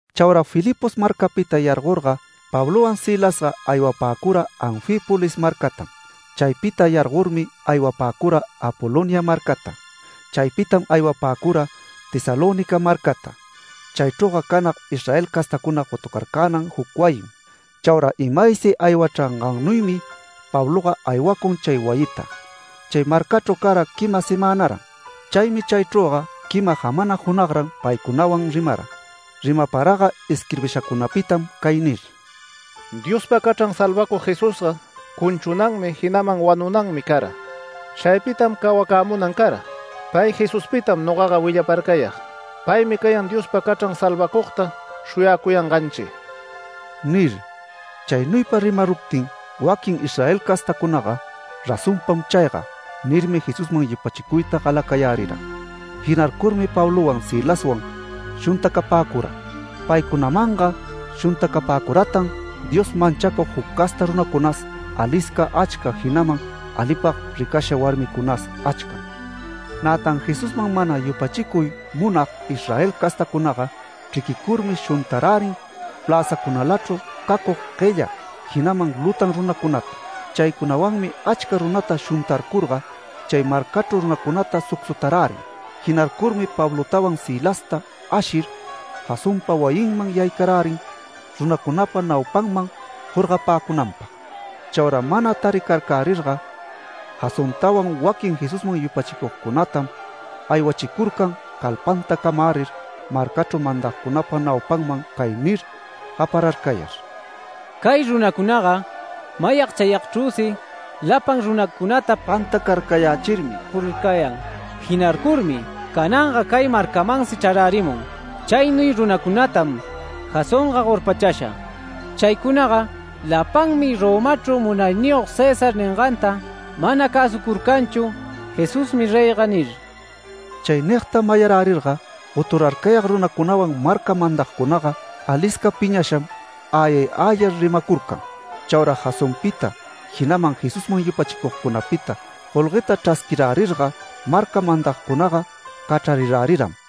Chaura Filipos marcapita yargorga, Pablowan Silasga aywapäcura Anfípolis marcatam. Chaypita yargormi aywapäcura Apolonia marcata. Chaypitam aywapäcura Tesalónica marcata. Chaychrüga canag Israel castacuna gotucarcänan juc wayim. Chauraga imaysi aywachrangannuymi Pabloga aywacun chay wayita, chay marcachru cara quima semänaran. Chaymi chaychrüga quima jamana junagrag paycunawan rimara. Rimaparaga isquirbishacunapitam cay nir: “Diospa cachran salvacug Jesusga cunchunanmi, jinaman wanunanmi cara. Chaypitam cawacämunan cara. Pay Jesuspitam nogaga willaparcayag. Paymi cayan Diospa cachran salvacugta shuyacuyanganchi” nir. Chaynuypa rimaruptin waquin Israel castacunaga “Razonpam chayga” nirmi Jesusman yupachicuyta galacayärira. Jinarcurmi Pablowan Silaswan shuntacapäcura. Paycunamanga shuntacapäcuratan Dios manchacug juc casta runacunas alisca achca, jinaman alipag ricasha warmicunas achcam. Nätan Jesusman mana yupachicuy munag Israel castacunaga chriquicurmi shuntarärin pläzacunalachru cacug guella, jinaman lutan runacunata. Chaycunawanmi achca runata shuntarcurga chay marcachru runacunata sucsutarärin. Jinarcurmi Pablotawan Silasta ashir, Jasonpa wayinman yaycarärin runacunapa naupanman jorgapäcunanpag. Chaura mana taricarcärirga Jasontawan waquin Jesusman yupachicugcunatam aywachicurcan calpanta camärir marcachru mandagcunapa naupanman cay nir gapararcayar: “Cay runacunaga mayag chayagchrüsi lapan runacunata pantacarcayächirmi purircayan. Jinarcurmi cananga cay marcamansi chrarärimun, chaynuy runacunatam Jasonga gorpachasha. Chaycunaga lapanmi Romachru Munayniyog César ninganta mana cäsucurcanchu, ‘Jesusmi reyga’ nir”. Chay nigta mayarärirga goturarcayag runacunawan marca mandagcunaga alisca piñasham “Äyay äyar” rimacurcan. Chaura Jasonpita, jinaman Jesusman yupachicugcunapita golgueta chrasquirärirga marca mandagcunaga cachrariräriram.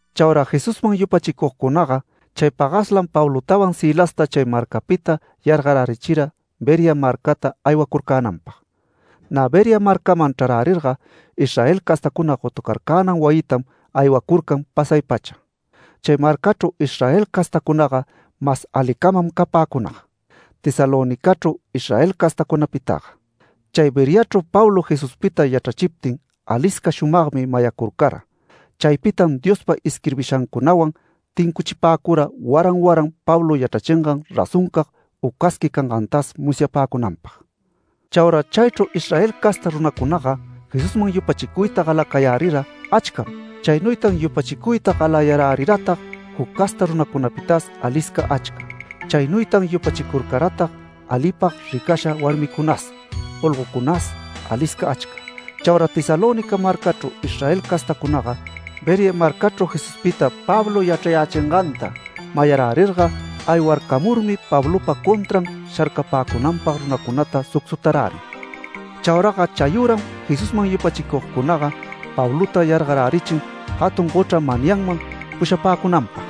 Chaura Jesusman yupachicugcunaga chay pagaslam Pablotawan Silasta chay marcapita yargarärichira Berea marcata aywacurcänanpag. Nä Berea marcaman chrarärirga Israel castacuna gotucarcänan wayitam aywacurcan pasay-pacha. Chay marcachru Israel castacunaga mas alicamam capäcunag, Tesalonicachru Israel castacunapitaga. Chay Bereachru Pablo Jesuspita yachrachiptin alisca shumagmi mayacurcara. Chaypitam Diospa isquirbishancunawan tincuchipäcura waran waran Pablo yachrachingan razoncag u casqui cangantas musyapäcunanpag. Chaura chaychru Israel casta runacunaga Jesusman yupachicuyta galayarärira achcam. Chaynuytan yupachicuyta galayaräriratag juc casta runacunapitas alisca achca. Chaynuytan yupachicurcaratag alipag ricasha warmicunas olgocunas, alisca achca. Chaura Tesalónica marcachru Israel castacunaga, Berea marcachru Jesuspita Pablo yachrayächinganta mayarärirga, aywarcamurmi Pablopa contran sharcapäcunanpag runacunata sucsutarärin. Chauraga chayüram Jesusman yupachicugcunaga Pablota yargarärichin jatun gochra manyanman pushapäcunanpag.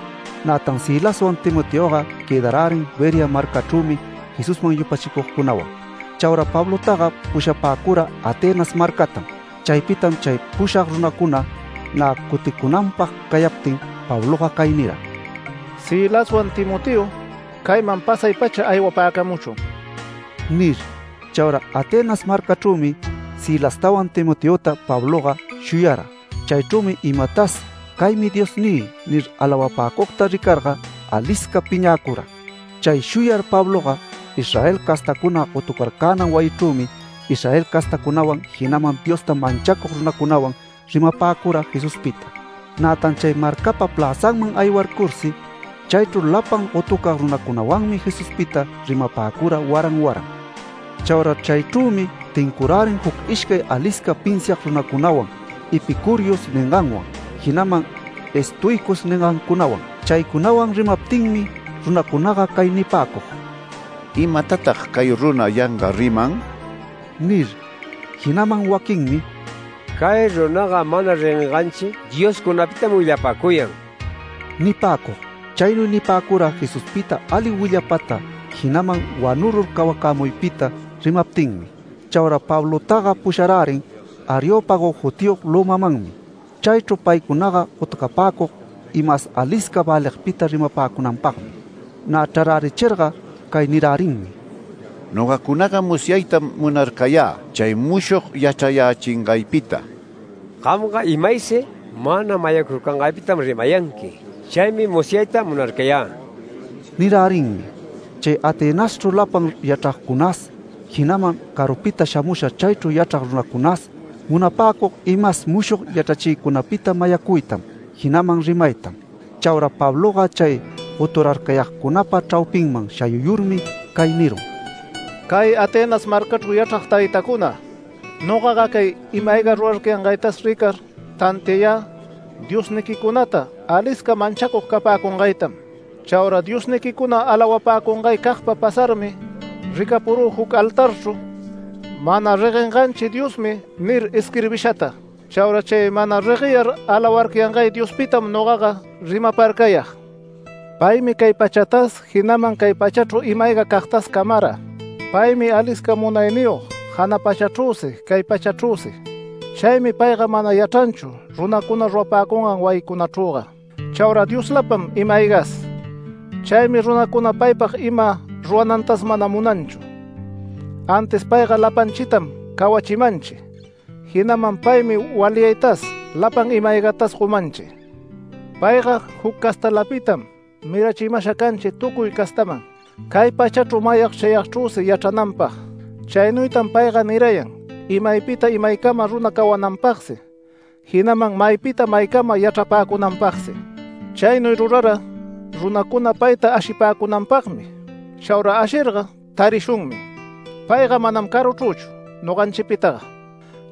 Nätan Silaswan Timoteoga quëdarärin Berea marcachrümi Jesusman yupachicugcunawan. Chaura Pablotaga pushapäcura Atenas marcatam. Chaypitam chay pushag runacuna nä cuticunanpag cayaptin Pabloga cay nira: “Silaswan Timoteo cayman pasay-pacha aywapäcamuchun” nir. Chaura Atenas marcachrümi Silastawan Timoteota Pabloga shuyara. Chaychrümi imatas “Caymi diosnï” nir alawapäcugta ricarga alisca piñäcura. Chay shuyar Pabloga Israel castacuna gotucarcänan wayichrümi Israel castacunawan, jinaman Diosta manchacug runacunawan rimapäcura Jesuspita. Nätan chay marcapa pläzanman aywarcursi chaychru lapan gotucag runacunawanmi Jesuspita rimapäcura waran waran. Chaura chaychrümi tincurärin juc ishcay alisca pinsiag runacunawan Epicúreos ninganwan, jinaman Estoicos ningancunawan. Chaycunawan rimaptinmi runacunaga cay nipäcug: “¿Imatatag cay runa yanga riman?” nir. Jinaman waquinmi “Cay runaga mana reguenganchi dioscunapitam willapacuyan” nipäcug. Chaynuy nipäcura Jesuspita ali willapata, jinaman wanurur cawacämuypita rimaptinmi. Chaura Pablotaga pusharärin Areópago jutiyog lömamanmi. Chaychru paycunaga gotucapäcug imas alisca väligpita rimapäcunanpagmi. Nä chrarärichirga cay nirärinmi: “Nogacunaga musyaytam munarcayä chay mushog yachrayächingaypita. Gamga imaysi mana mayacurcangäpitam rimayanqui. Chaymi musyayta munarcayä” nirärinmi. Chay Atenaschru lapan yachragcunas, jinaman carupita shamusha chaychru yachrag runacunas munapäcug imas mushog yachrachiycunapita mayacuytam jinaman rimaytam. Chaura Pabloga chay goturarcayagcunapa chraupinman shayuyurmi cay nirun: “Cay Atenas marcachru yachrag taytacuna, nogaga cay ima-ayga rurarcayangaytas ricar tantiayä diosniquicunata, alisca manchacug capäcungaytam. Chaura diosniquicuna alawapäcungaycagpa pasarmi ricapurü juc altarchru ‘MANA REGUENGANCHI DIOSMI’ nir isquirbishata. Chaura chay mana regueyar alawarcayangay Diospitam nogaga rimaparcayag. Paymi cay pachatas jinaman cay pachachru ima-aygacagtas camara. Paymi alisca munayniyog jana pachachrüsi cay pachachrüsi. Chaymi payga mana yachranchu runacuna rurapäcungan wayicunachrüga. Chaura Dioslapam ima-aygas, chaymi runacuna paypag ima ruranantas mana munanchu, antis payga lapanchitam cawachimanchi, jinaman paymi walyaytas, lapan ima-aygatas gomanchi. Payga juc castalapitam mirachimasha canchi tucuy castaman, cay pachachru mayag chayagchrüsi yachrananpag. Chaynuytan payga nirayan imaypita imaycama runa cawananpagsi, jinaman maypita maycama yachrapäcunanpagsi. Chaynuy rurara runacuna payta ashipäcunanpagmi. Chaura ashirga tarishunmi. Payga manam caruchrüchu noganchipitaga.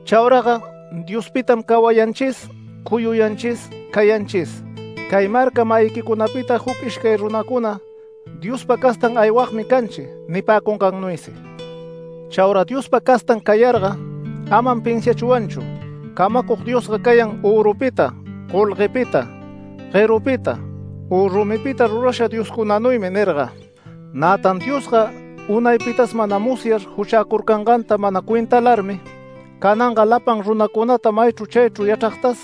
Chauraga Diospitam cawayanchis cuyuyanchis cayanchis. Cay marca-mayiquicunapita juc ishcay runacuna ‘Diospa castan aywagmi canchi’ nipäcungannuysi. Chaura Diospa castan cayarga amam pinsiachwanchu ‘Camacug Diosga cayan örupita, golguepita, guerupita, u rumipita rurasha dioscunanuymi’ nirga. Nätan Diosga unaypitas mana musyar juchäcurcanganta mana cuentalarmi, cananga ‘Lapan runacunata maychru chaychru yachragtas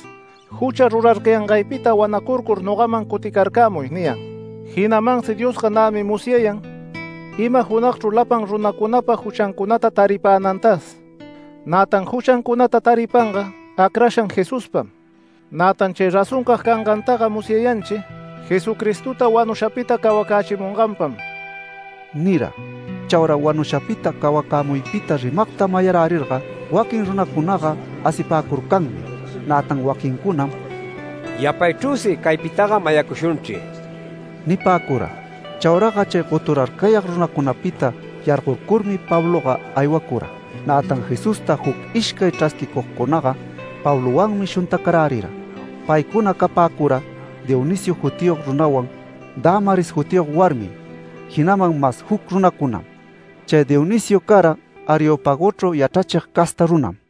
jucha rurarcayangaypita wanacurcur nogaman cuticarcämuy’ niyan. Jinamansi Diosga nämi musyayan ima junagchru lapan runacunapa juchancunata taripänantas. Nätan juchancunata taripanga acrashan Jesuspam, nätan chay razoncag cangantaga musyayanchi Jesucristota wanushapita cawacächimunganpam” nira. Chaura wanushapita cawacämuypita rimagta mayarärirga, waquin runacunaga asipäcurcanmi. Nätan waquincunam “Yapaychrüsi caypitaga mayacushunchri” nipäcura. Chauraga chay goturarcayag runacunapita yargorcurmi, Pabloga aywacura. Nätan Jesusta juc ishcay chrasquicugcunaga Pablowanmi shuntacarärira. Paycuna capäcura Dionisio jutiyog runawan Dámaris jutiyog warmim, jinaman mas juc runacunam. Chay Dionisio cara Areopagochru yachrachig casta runam.